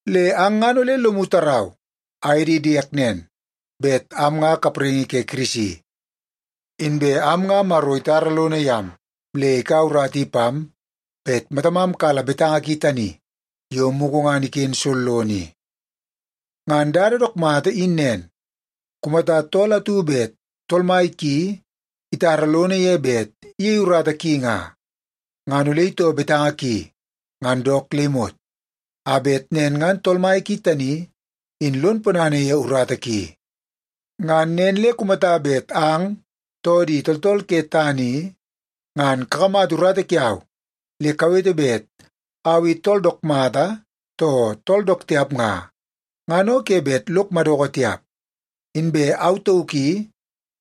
Le ang ngan ole lomu tarau aye di diek nen, bet am nga kapraingi ke Kirisi. Inbe am nga Maro itara lono yam le ikaua urata i pam bet matamam kala betanga ki tani yo mugu ngan iken sollono i. Ngan dada dook mata in nen, kumata tool atu bet tool mai ki itara lono ye bet iyei urata ki nga, ngan ole itoo betanga ki ngan dook le imot, a bet nen ngan tool mai ki tani in lon ponana ye urata ki. Ngan nen le kumata bet ang, too di tooltool ke tana i, ngan kakamata urata kiau le kawete bet au i tool dook mata too tool dook tiap nga, ngan o ke bet lok madoko tiap. Inbe au tauk i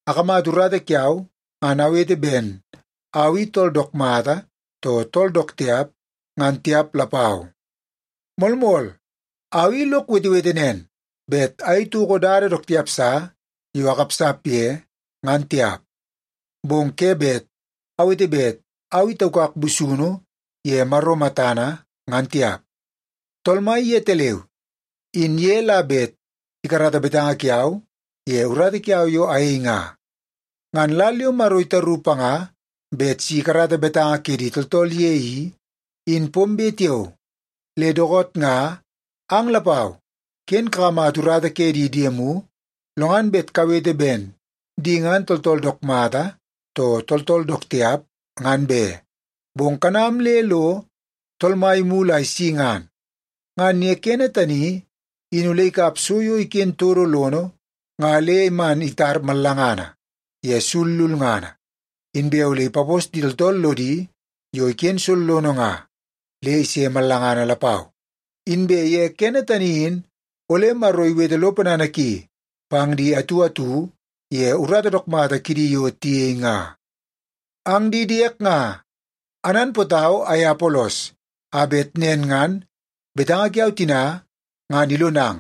akamata urata kiau ngan awete ben au i tool dook mata, too tool dook tiap, ngan tiap lapau. Moolmool, au i lok wetewete nen bet ayei toko dada dook tiap sa yo akapsap ye, ngan tiap. Bong ke bet awete bet au i taukak busunu ye Maro matana ngan tiap. Tool Mai yetaleu in ye la bet ikarata betanga kiau ye urata kiau yo ayei nga. Ngan lal yo Maro itaru panga bet si ikarata betanga ke di tooltool ye i, in pombe tiao. Le dookoot nga ang lapau ken kakamata urata ke di diemu lo ngan bet kawete ben di ngan tooltool dook mata, too tooltool dook tiap, ngan be. Bong kanam le lo Tool Mai imulu a isi ngan. Ngan ye kene tani in ole ikap so yo iken todo lono nga le man itar mallangana ye sul lulngana. Inbe ole ipapos di tooltool lodi yo iken sollono nga le ise mallangana lapau. Inbe ye kene tani in ole Maro iwete lo ponana ki pang di atu atu ye urata dook mata kidi yo tiyei nga. Ang di diek nga, ananpootau aye Apolos a bet nen ngan betanga kiau tina ngan ilonang,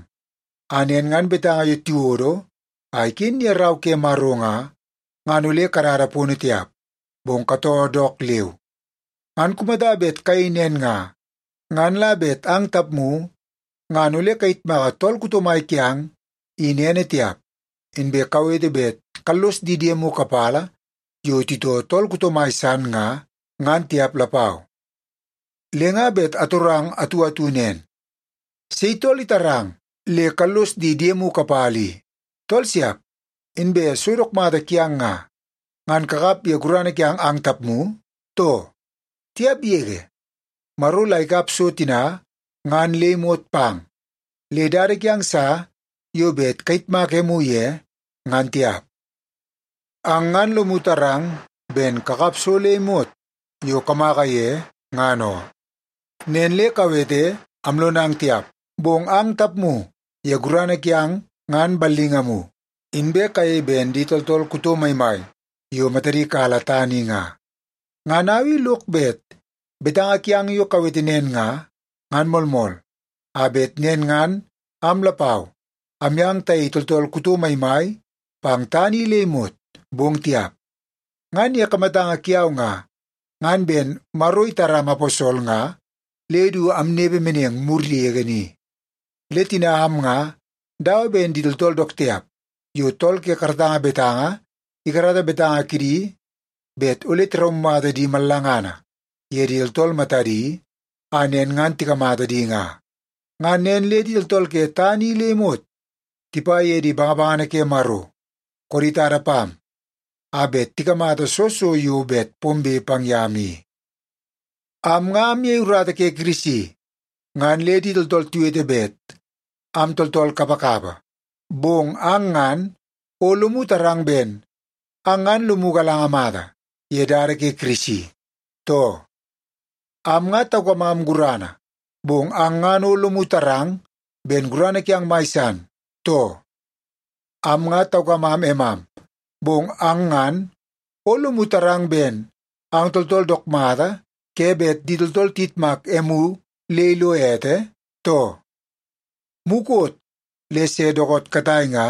a nen ngan betanga yo tiwodo a iken ye Rau ke Maro nga, ngan ole kadada pono tiap, bong katoo dook leu. Ngan kumata bet kayei nen nga, ngan la bet ang tapmu ngan ole kayitmaka tool kuto mai kiang in ene tiap, inbe kawete bet kallos di diemu kapala yo titoo tool kuto mai san nga, ngan tiap lapau. Le nga bet atorang atu atu nen: Sei tool itarang le kallos di diemu kapala i? Tool siap! Inbe so dook mata kiang nga, ngan kakap ye gurana kiang ang tapmu, too? Tiap yege! Maro la ikap so tina ngan le imot pang, le dada kiang sa yo bet kayitmak emu ye, ngan tiap. Ang ngan lomu tarang ben kakap so le imot yo kamaka ye ngan oo. Nen le kawete amlonang tiap, bong ang tapmu ye gurana kiang ngan ballingamu, inbe kayei ben di tooltool kuto maimai yo matadi kala tana i nga. Ngan au i lok bet betanga kiang yo kawete nen nga, ngan moolmool, a bet nen ngan am lapau amyang tayei tooltool kuto maimai pang tana i le imot, bong tiap. Ngan ye kamatanga kiau nga, ngan ben Maro itaram aposol nga le du amnepe meneng mur yege ni. Le tina am nga dawa ben di tooltool dook tiap yo tool ke karatanga betanga ikarata betanga kidi bet ole tiraumata di mallangana ye di tooltool matadi a nen ngan tikamata di nga. Ngan nen le di tooltool ke tana i le imot tipa ye di bangabangana ke Maro koodi tada pam a bet tikamata soo so yo bet pombe pang yam i. Am nga amyei urata ke Kirisi ngan le di tooltool tiwete bet am tooltool kapakapa. Bong ang ngan o lomu tarang ben ang ngan lomu galanga mata ye dada ke Kirisi, too? Am nga taukamam gurana, bong ang ngan o lomu tarang ben gurana kiang mai san, too? Am nga taukamam emam, bong ang ngan o lomu tarang ben ang tooltool dook mata ke bet di tooltool tiyitmak emu le ilo ete, too? Mukot le se dookoot katai nga,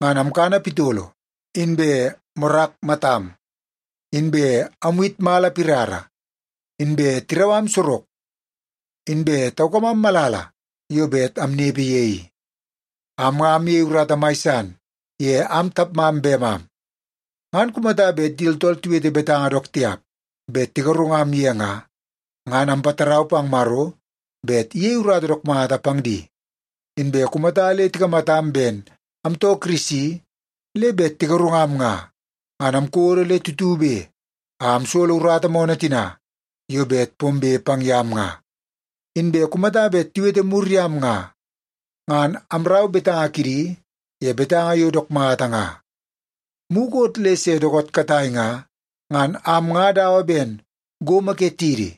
ngan amkana pitolo inbe morak matam. Inbe amwit mala pirara, inbe tirau am sorok, inbe taukamam malala yo bet amnepe ye i. Am nga amyei urata mai san ye am tapmam bemam. Ngan kumata bet di tooltool tiwete betanga dook tiap bet tigarungam ye nga, ngan ampatarau pang Maro bet iyei urata dook mata pang di. Inbe kumata le tikamatam ben amtoo Kirisi le bet tigarungam nga, ngan amkodo le tutube a amsolo urata moonoo tina yo bet pombe pang yam nga. Inbe kumata bet tiwete mur yam nga, ngan amrau betanga kidi ye betanga yo dook mata nga. Mukot le se dookoot katai nga, ngan am nga dawa ben gomo ke tidi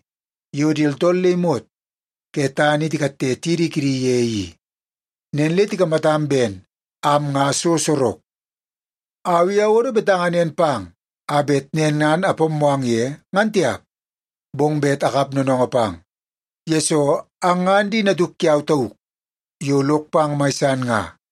yo di tooltool le imot ke tana i tikatte tidi kidi ye i. Nen le tikamatam ben am nga so sorok. Au i awodo betanga nen pang a bet nen ngan apammoo ang ye, ngan tiap, bong bet akap noonoongoo pang, yesoo ang ngan di natuk kiau tauk yo lok pang mai san nga.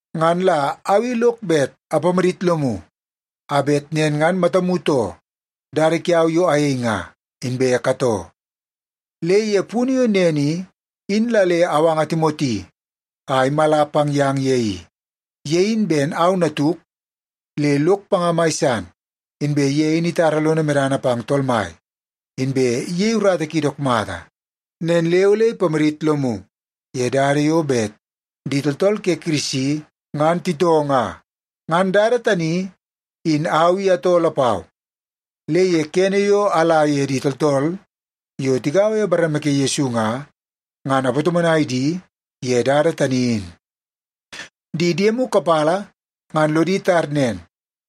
Ngan la au i lok bet apamadit lomu a bet nen ngan matamu too dada kiau yo ayei nga, inbe katoo. Le ye punu yo nen i, in la le awanga Timoti a imala pang yang ye i. Ye in ben au natuk le lok panga mai san. Inbe ye in itara lono medana pang Tool Mai, inbe iyei urata ki dook mata. Nen le ole ipamadit lomu ye dada yo bet di tooltool ke Kirisi ngan titoo nga. Ngan dada tani in au i atoo lapau, le ye kene yo ala ye di tooltool yo tigaua ye bareme ke Yesu nga, ngan apatomonai di ye dada tani in. Di diemu kapala ngan lodi tar nen,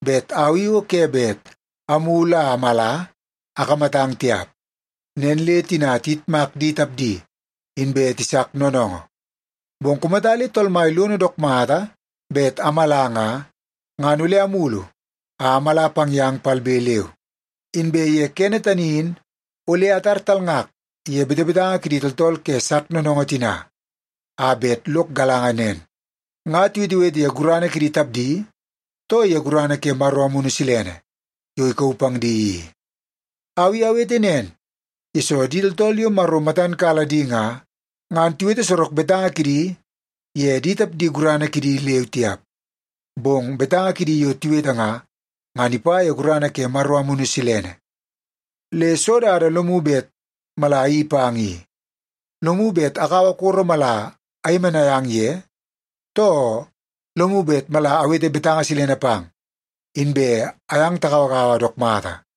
bet au i o ke bet amulu a amala akamatang tiap. Nen le tina tiyitmak di tapdi, inbe tisak noonoongoo. Bong kumata le Tool Mai lono dook mata bet amala nga, ngan ole amulu a amala pang yang palbe leu. Inbe ye kene tani in ole atar talngak ye betebetanga kidi tooltool ke sak noonoongoo tina a bet lok galanga nen, nga tiwetewete ye gurana kidi tapdi, too ye gurana ke Maro Amunu Silene yo ikauu pang di i. Au i awete nen, yesoo di tooltool yo Maro matan kala di nga, ngan tiwete sorok betanga kidi ye di tapdi gurana kidi leu tiap. Bong betanga kidi yo tiwete nga, ngan ipa ye gurana ke Maro Amunu Silene. Le soo dada lomu bet mala ayeii pang i? Lomu bet akaua koro mala ayemenai ang ye, too lomu bet mala awete betanga silene pang inbe ayang tagauagaua dook mata?